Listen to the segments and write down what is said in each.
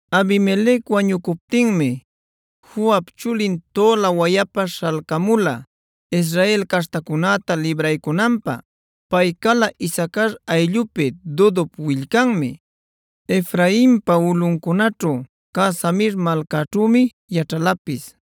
Abimelec wañucuptinmi Fuap chulin Tola wayapa śhalcamula Israel caśhtacunäta libraycunanpä. Pay cala Isacar ayllupi Dodop willcanmi; Efrainpa ulꞌuncunaćhu cä Samir malcaćhümi yaćhalapis.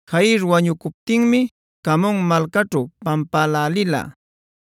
Jair wañucuptinmi Camon malcaćhu pampälälila.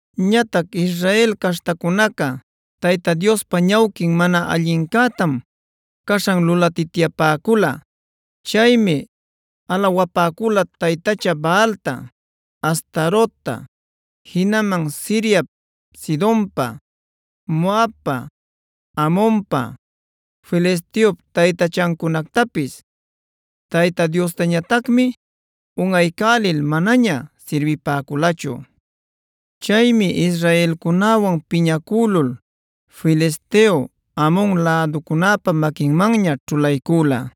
Ñatac Israel caśhtacunaca Tayta Diospa ñawquin mana allincätam caśhan lulatityapäcula. Chaymi alawapäcula taytacha Baalta, Astarota, jinaman Siriap, Sidonpa, Moabpa, Amonpa, Filisteop taytachancunactapis. Tayta Diosñatacmi unꞌaycälil manaña sirbipäculachu. Chaymi israelcunäwan piñacülul Filisteo, Amon läducunäpa maquinmanña ćhulaycüla.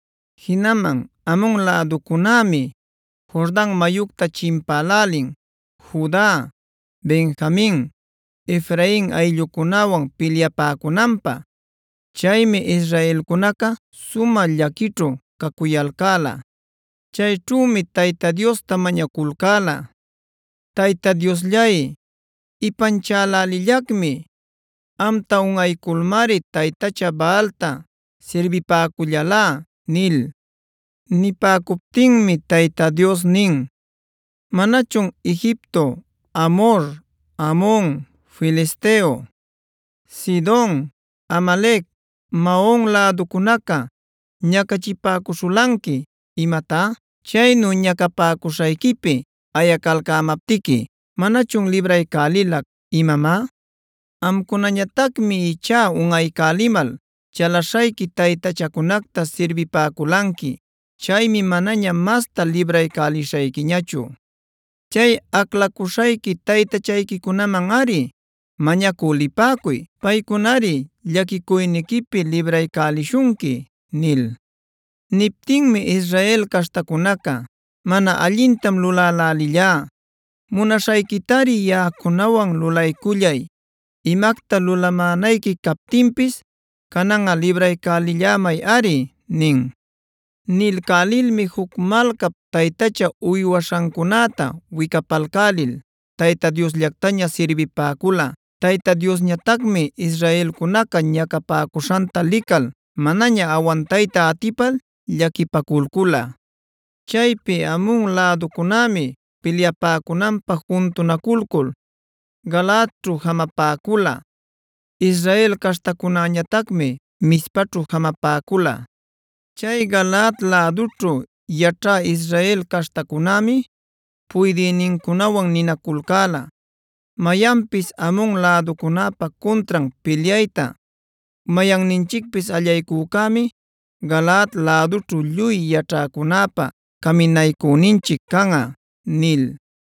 Jinaman Amon läducunämi Jordan mayucta chimpälälin Juda, Benjamin, Efrain ayllucunäwan pilyapäcunanpä. Chaymi israelcunaca sumä llaquićhu cacuyalcäla. Chayćhümi Tayta Diosta mañaculcäla: “Tayta Diosllay, ipanchälälillacmi; amta unꞌayculmari taytacha Baalta sirbipacullälá” nil. Nipäcuptinmi Tayta Dios nin: “¿Manachun Egipto, Amhor, Amon, Filisteo, Sidon, Amalec, Maon läducunaca ñacachipäcuśhulanqui imatá? Chaynu ñacapäcuśhayquipi ayacalcämaptiqui ¿manachun libraycälilac, imamá? Amcunañatacmi ichá unꞌaycälimal chalaśhayqui taytachacunacta sirbipäculanqui. Chaymi manaña mastá libraycälishayquiñachu. Chay aclaculcäśhayqui taytachayquicunamanꞌari mañacü lipäcuy. Paycunari llaquicuyniquipi libraycälishunqui” nil. Niptinmi Israel caśhtacunaca: “Mana allintam lulälälillá; munaśhayquitari yaꞌacunawan lulaycullay. Imacta lulamänayqui captinpis cananꞌa libraycälillämayꞌari” nin. Nilcälilmi juc malcap taytacha uywaśhancunäta wicapalcälil Tayta Diosllactaña sirbipäcula. Tayta Diosñatacmi israelcunaca ñacapäcuśhanta lical manaña awantayta atipal llaquipaculcula. Chaypi Amon läducunämi pilyapäcunanpä juntunaculcul Galaadćhu jamapäcula. Israel caśhtacunäñatacmi Mizpaćhu jamapäcula. Chay Galaad lädućhu yaćhä Israel caśhtacunämi puydïnincunawan ninaculcäla: “Mayanpis Amon läducunäpa cuntran pilyayta mayanninchicpis allaycücämi Galaad lädućhu lluy yaćhäcunäpa caminaycüninchic canꞌa” nil.